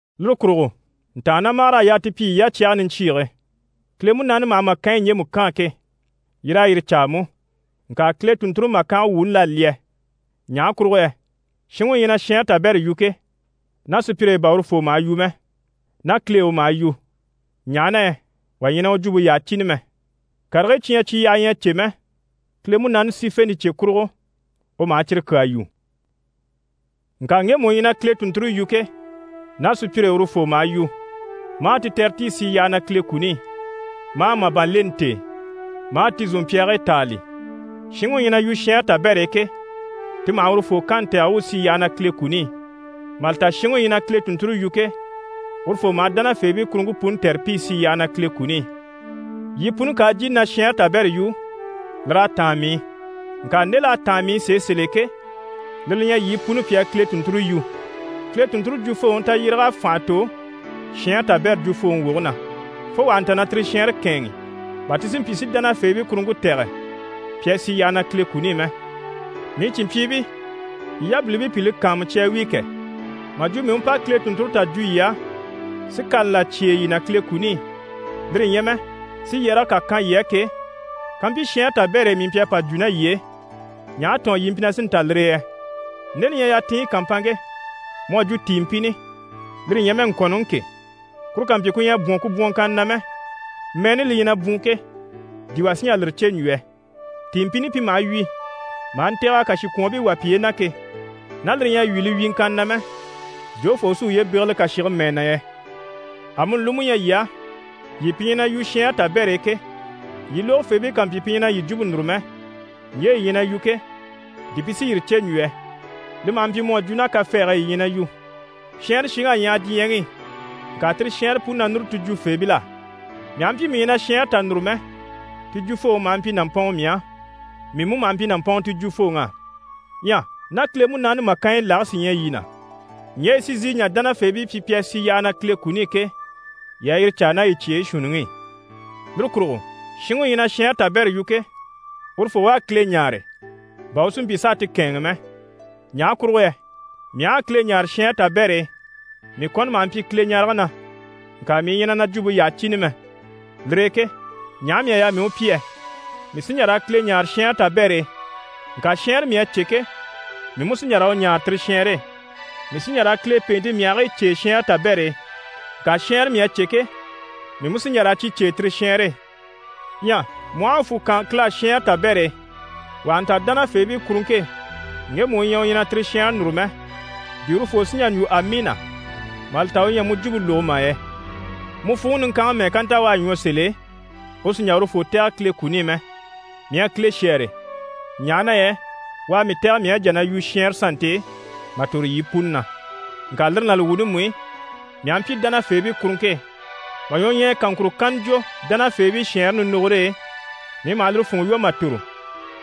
Lire kurugo ntàannamagar'à yaa ti pyi yii yacyage niɲcyiige. Kile Munaani maha màkanyi ɲjemu kaan ke, yii raa yire caa mú. Ŋka Kile tùnnture ɲjwuŋi màkange wuuni l'à lyɛ. Ɲaha kurugo yɛ shinŋi u ɲyɛ na shɛɛnre tabɛrɛ yu ke, ná sùpyire e bà urufoo maha yu mɛ, ná Kile e u maha yu, ɲaha na yɛ wà ɲyɛ na u jwumpe yyaha cìni mɛ. Karigii cyi ɲyɛ cyi yyaha ɲyɛ a cè mɛ, Kile Munaani sífente cye kurugo u maha cyire kyaa yu. Ŋka ŋgemu u ɲyɛ na Kile tùnnture yu ke, ná sùpyire e urufoo maha yu, maa ti tɛ̀re ti i sì yyaha na Kile kuni i, maa màban leni t'e, maa ti zòmpyaagii tàali. Shinŋi u ɲyɛ na yu shɛɛnre tabɛr'e ke, ti maha urufoo kanni tɛ̀re u u sì yyaha na Kile kuni i. Mà li ta shinŋi u ɲyɛ na Kile tùnnture yu ke, urufoo maha dánafeebii kuruŋke puni tɛ̀re pi i sì yyaha na Kile kuni i. Yii puni ká a jìni na shɛɛnre tabɛrɛ yu, lir'à táan mii i. Ŋka nde l'à táan mii i sèe sèl'e ke, lire li ɲyɛ yii puni pi a Kile tùnnture yu. Kile tùnnture jwufooŋi tayyéreg'à fànha tò shɛɛnre tabɛrɛ jwufooŋi woge na, fo wà ha nta na tire shɛɛnre kɛ̂ɛnŋi, bà ti si mpyi si dánafeebii kuruŋke tɛ̀gɛ pi a sì yyaha na Kile kuni i mɛ. Mii cìnmpyiibii, yii yabilimpii pi li kàanmucya a wíi kɛ! Mà jwo mii u pa Kile tùnnture tà jwo yii á, si kani là cyêe yii na Kile kuni i, lire ɲyɛ mɛ si yɛrɛge kà kan yii á ke, kampyi shɛɛnre tabɛr'e mii mpyi a pa jwo ná yii e, ɲaha tɔ̀ɔn yii mpyi na sí n‑ta lire e yɛ? Nde li ɲyɛ yatinɲyi kàmpanŋke, mu à jwo tìinmpini, lire ɲyɛ mɛ ŋkɔ̀nnɔŋi ke, kuru ká mpyi ku ɲyɛ a bwɔ̀n ku bwɔ̀nŋkanna na mɛ, mɛɛni li ɲyɛ na bwùun ke, di wà sí n‑jà lire cè n‑jwo yɛ? Tìinmpini pi maha wyì maha ntɛ̀g'a kàshikwɔɔnbii wà piye na ke, ná lire ɲyɛ a wyì li wyìŋkanna na mɛ, jofoo u sí uye bégele kàshige mɛɛ na yɛ? Amuni li mú ɲyɛ yii á, yii pi ɲyɛ na yu shɛɛnre tabɛr'e ke, yii lógofeebii ká mpyi pi ɲyɛ na yii jwumpe núru mɛ, ɲje yii ɲyɛ na yu ke, di pi sí yire cè n‑jwo yɛ? Li maha mpyi mu à jwo ná kafɛɛge e yii ɲyɛ na yu. Shɛɛnre shiŋ'à ɲyaha diɲyɛŋi i, ŋka tire shɛɛnre puni na núru ti jwufeebil'á. Mii aha mpyi mii ɲyɛ na shɛɛnre tà núru mɛ, ti jwufooŋi maha mpyi nàmpɔnŋɔ mii á, mii mú maha mpyi nàmpɔnŋɔ ti jwufooŋ'á. Ɲyɛ ná Kile Munaani màkanyi lage sí ɲyɛ yii na, ɲje yi sí n‑sìi n‑jà dánafeebii pyi pi a sì yyaha na Kile kuni i ke, yii a yire caa ná yii cyeyi shuunniŋi i. Lire kurugo shinŋi u ɲyɛ na shɛɛnre tabɛrɛ yu ke, urufoo u a Kile ɲáare, bà u si mpyi s'a ti kɛ̂ɛnŋi mɛ. Ɲaha kurugo yɛ mii aha a Kile ɲáare shɛɛnre tabɛr'e, mii kɔni maha mpyi Kileɲarege na, ŋka mii ɲyɛ na na jwumpe yyaha cìni mɛ. Lire e ke ɲaha mii à yaa mii u pyi yɛ? Mii sí n‑jà raa Kile ɲáare shɛɛnre tabɛr'e, ŋka shɛɛnre mii à cè ke, mii mú sí n‑jà raa u ɲáare tire shɛɛnre e. Mii sí n‑jà raa Kile pèente myahigii cêe shɛɛnre tabɛr'e, ŋka shɛɛnre mii à cè ke, mii mú sí n‑jà raa cyi cêe tire shɛɛnre e. Ɲyɛ mu aha a fwù kaan Kile á shɛɛnre tabɛr'e, wà ha nta dánafeebii kuruŋke e ŋgemu u ɲyɛ u ɲyɛ na tire shɛɛnre núru mɛ, di urufoo sí n‑jà n‑jwo: «Amiina» mà li ta u ɲyɛ a mu jwumpe lógo mà yɛ? Mu fwùŋi niŋkanŋi mɛ́ɛ ká nta u à ɲwɔ sèl'e, u sì n‑jà urufoo tɛ̀gɛ Kile kuni i mɛ. Mii à Kile shɛ́ɛre, ɲaha na yɛ u à mii tɛ̀gɛ mii à jà na yu shɛɛnre sannte e mà tòro yii puni na. Ŋka lire ná li wuuni mú i, mii aha mpyi dánafeebii kuruŋke e, mà ɲwɔɲyɛya kaŋkuro kanna jwo dánafeebii shɛɛnre nindogore e, mii maha lire funŋɔ lwɔ́ maha ntòro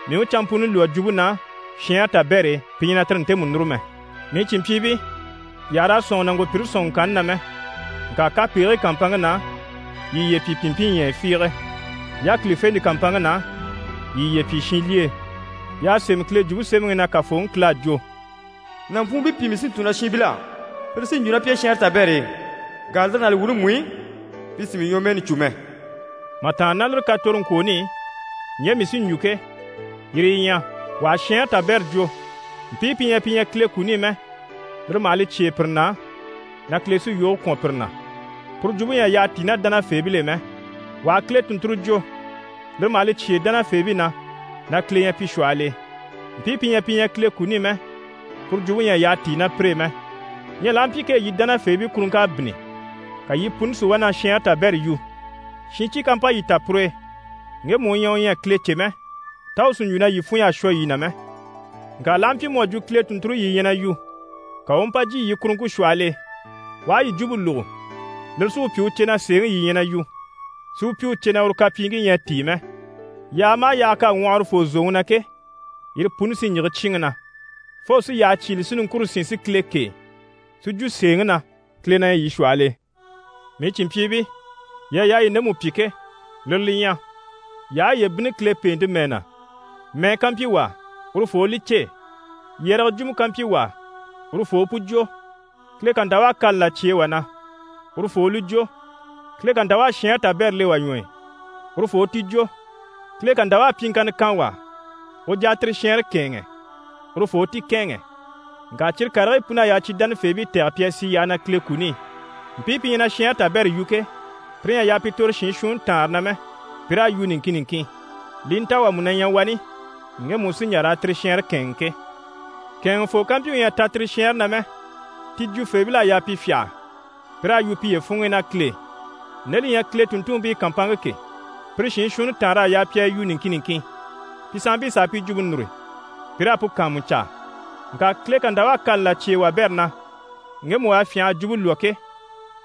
mii u canmpuni lwɔ́ jwumpe na shɛɛnre tabɛr'e pi ɲyɛ na tire ntemu núru mɛ. Mii cìnmpyiibii, yii àha raa sɔ̂nŋi nàŋkopyire sɔ̀nŋɔŋkanni na mɛ. Ŋka kapegigii kàmpanŋke na, yii yiye pyi pìnmpinɲyɛyɛ fiige. Yákilifente kàmpanŋke na, yii yiye pyi shinlyee. Y'à sémɛ Kile Jwumpe Semɛŋi i na Kafooŋi Kile à jwo: «Nàmpwuunbii pìi mii sí n‑tun na shiinbil'á. Pire sí n‑jwo ná pi e shɛɛnre tabɛr'e. Ŋka lire ná li wuuni mú i, pi sì mii ɲwɔmɛɛni cû mɛ.» Mà tàanna ná lire katoroŋkwooni i, ɲje mii sí n‑jwo ke, yire yi ɲyɛ: wà ha shɛɛnre tabɛrɛ jwo, mpii pi ɲyɛ pi ɲyɛ Kile kuni i mɛ, lire maha li cyêe pire na na Kile sí yoge kwɔ̀n pire na. Puru jwumpe ɲyɛ a yyaha tíi ná dánafeebil'e mɛ. Wà ha Kile tùnnturo jwo, lire maha li cyêe dánafeebii na na Kile ɲyɛ pi shwɔhɔl'e. Mpii pi ɲyɛ pi ɲyɛ Kile kuni i mɛ, puru jwumpe ɲyɛ a yyaha tíi ná pire e mɛ. Ɲyɛ l'aha mpyi kee yii dánafeebii kuruŋk'à bínni, ka yii puni si wá na shɛɛnre tabɛrɛ yu, shincyi ká mpa yii ta pur'e, ŋgemu u ɲyɛ u ɲyɛ a Kile cè mɛ, tá u sí n‑jwo na yii funɲy'à shwɔ yii na mɛ? Ŋka l'aha mpyi mu à jwo Kile tùnnture yii ɲyɛ na yu, ka u u mpa jyè yii kuruŋke shwɔhɔl'e, u aha yii jwumpe lógo, lire sí u pyi u cè na sèeŋi yii ɲyɛ na yu, si u pyi u cè na uru kapyiiŋkii ɲyɛ a tíi mɛ. Yaaga maha yaaga k'à ŋwɔhɔ urufoo zòŋi na ke, yire puni sí n‑yige cyíinŋi na, fo u sí yyahe cyígile si niŋkure sín si Kile kêe, si jwo sèeŋi na, Kile na ɲyɛ yii shwɔhɔl'e. Mii cìnmpyiibii, yii à yaa yii ndemu pyi ke, lire li ɲyɛ: yii aha yiye bínni Kile pèente mɛɛ na, mɛɛ ká mpyi wà á, urufoo u li cêe. Yɛrɛgɛ jwumɔ ká mpyi wà á, urufoo u pu jwo, Kile ká nta u à kani là cyêe wà na, urufoo u li jwo. Kile ká nta u à shɛɛnre tabɛrɛ le wà ɲwɔ e, urufoo u ti jwo. Kile ká nta u à pyiŋkanna kan wà á u u jà a tire shɛɛnre kɛ̂ɛnŋɛ, urufoo u ti kɛ̂ɛnŋɛ. Ŋka cyire karigii pun'à yaa cyi dánafeebii tɛ̀gɛ pi a sì yyaha na Kile kuni i. Mpii pi ɲyɛ na shɛɛnre tabɛrɛ yu ke, pire ɲyɛ a yaa pi tòro shiin shuunni taanre na mɛ, pi raa yu niŋkin niŋkin, li i nta wà mú na ɲyɛ wani ŋgemu u sí n‑jà raa tire shɛɛnre kɛ̂ɛnŋi ke. Kɛ̀ɛnŋɛfoo ká mpyi u ɲyɛ a ta tire shɛɛnre na mɛ, ti jwufeebil'à yaa pi fyâha, pi raa yu piye funŋ'i ná Kile e. Nde li ɲyɛ Kile tùnntunmpii kàmpanŋke ke, pire shiin shuunni taanr'à yaa pi a yu niŋkin niŋkin. Pi sanmpii s'a pi jwumpe núru pi raa pu kàanmucaa. Ŋka Kile ká nta u à kani là cyêe wabɛrɛ na, ŋgemu u à fyânha a jwumpe lwɔ́ ke,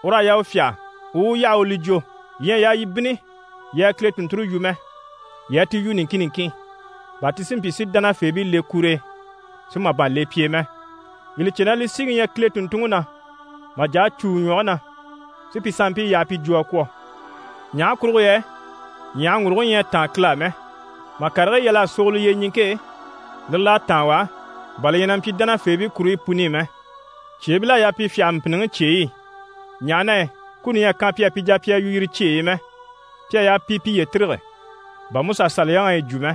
ur'à yaa u fyâha, u u u yaha u li jwo. Yii ɲyɛ a yaa yii bínni yii a Kile tùnnture yu mɛ, yii a ti yu niŋkin niŋkin, bà ti si mpyi si dánafeebii le kur'e, si màban le pi e mɛ. Yii li cè na li síŋi ɲyɛ Kile tùnntunŋi na mà jà a cû u ɲwɔge na, si pi sanmpii yaha pi jwo a kwɔ̀. Ɲaha kurugo yɛ ɲyàhaŋguruguŋi ɲyɛ a táan Kile á mɛ, mà karigii yal'a sogolo yyeɲiŋke e, lire l'à táan u á, bà li ɲyɛ na mpyi dánafeebii kuruɲyi puni i mɛ. Cyeebil'à yaa pi fyâha mpìnniŋi cyeyi i, ɲaha na yɛ kuni ɲyɛ a kan pi á, pi jà pi a yu yire cyeyi i mɛ. Pi à yaa pi piye tîrige, bà MusaSaliyaŋi à yi jwo mɛ.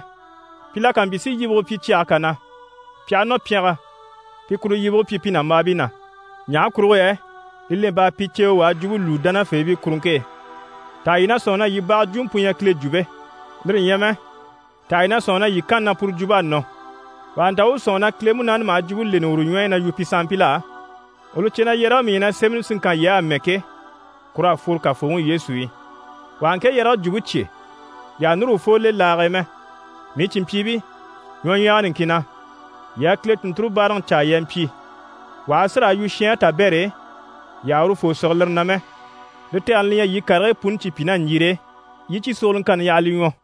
Pi la ká mpyi si yibige pyi cyage kà na, pi aha nɔ pyɛngɛ pi kuru yibige pyi pi nàmbaabii na. Ɲaha kurugo yɛ li lemp'à pi ceewe u a jwumpe lwúu dánafeebii kuruŋke e. Taha yii na sɔ̂nŋi na yii baga jwumɔ pu ɲyɛ Kile jwumpe? Lire ɲyɛ mɛ, taha yii na sɔ̂nŋi na yii kanni na puru jwump'à nɔ? Wà ha nta u u sɔ̂nŋi na Kile Munaani maha jwumpe leni uru ɲwɔ e na yu pi sanmpil'á, u li cè na yɛrɛge mii ɲyɛ na sémɛni si ŋkan yii á amɛ ke, kur'à fworo Kafooŋi Yesu i. Wà ha ŋke yɛrɛge jwumpe cyé, yii àha núru urufoo le laage e mɛ. Mii cìnmpyiibii, ɲwɔɲyɛga niŋkin na, yii a Kile tùnnture báaraŋi caa yii a mpyi. Wà ha a si raa yu shɛɛnre tabɛr'e, yii àha urufoo sige lire na mɛ. Li tɛgɛni li ɲyɛ, yii karigii puni cyi pyi ná ɲjire e, yii i cyi sogoloŋkanni yaha li ɲwɔ.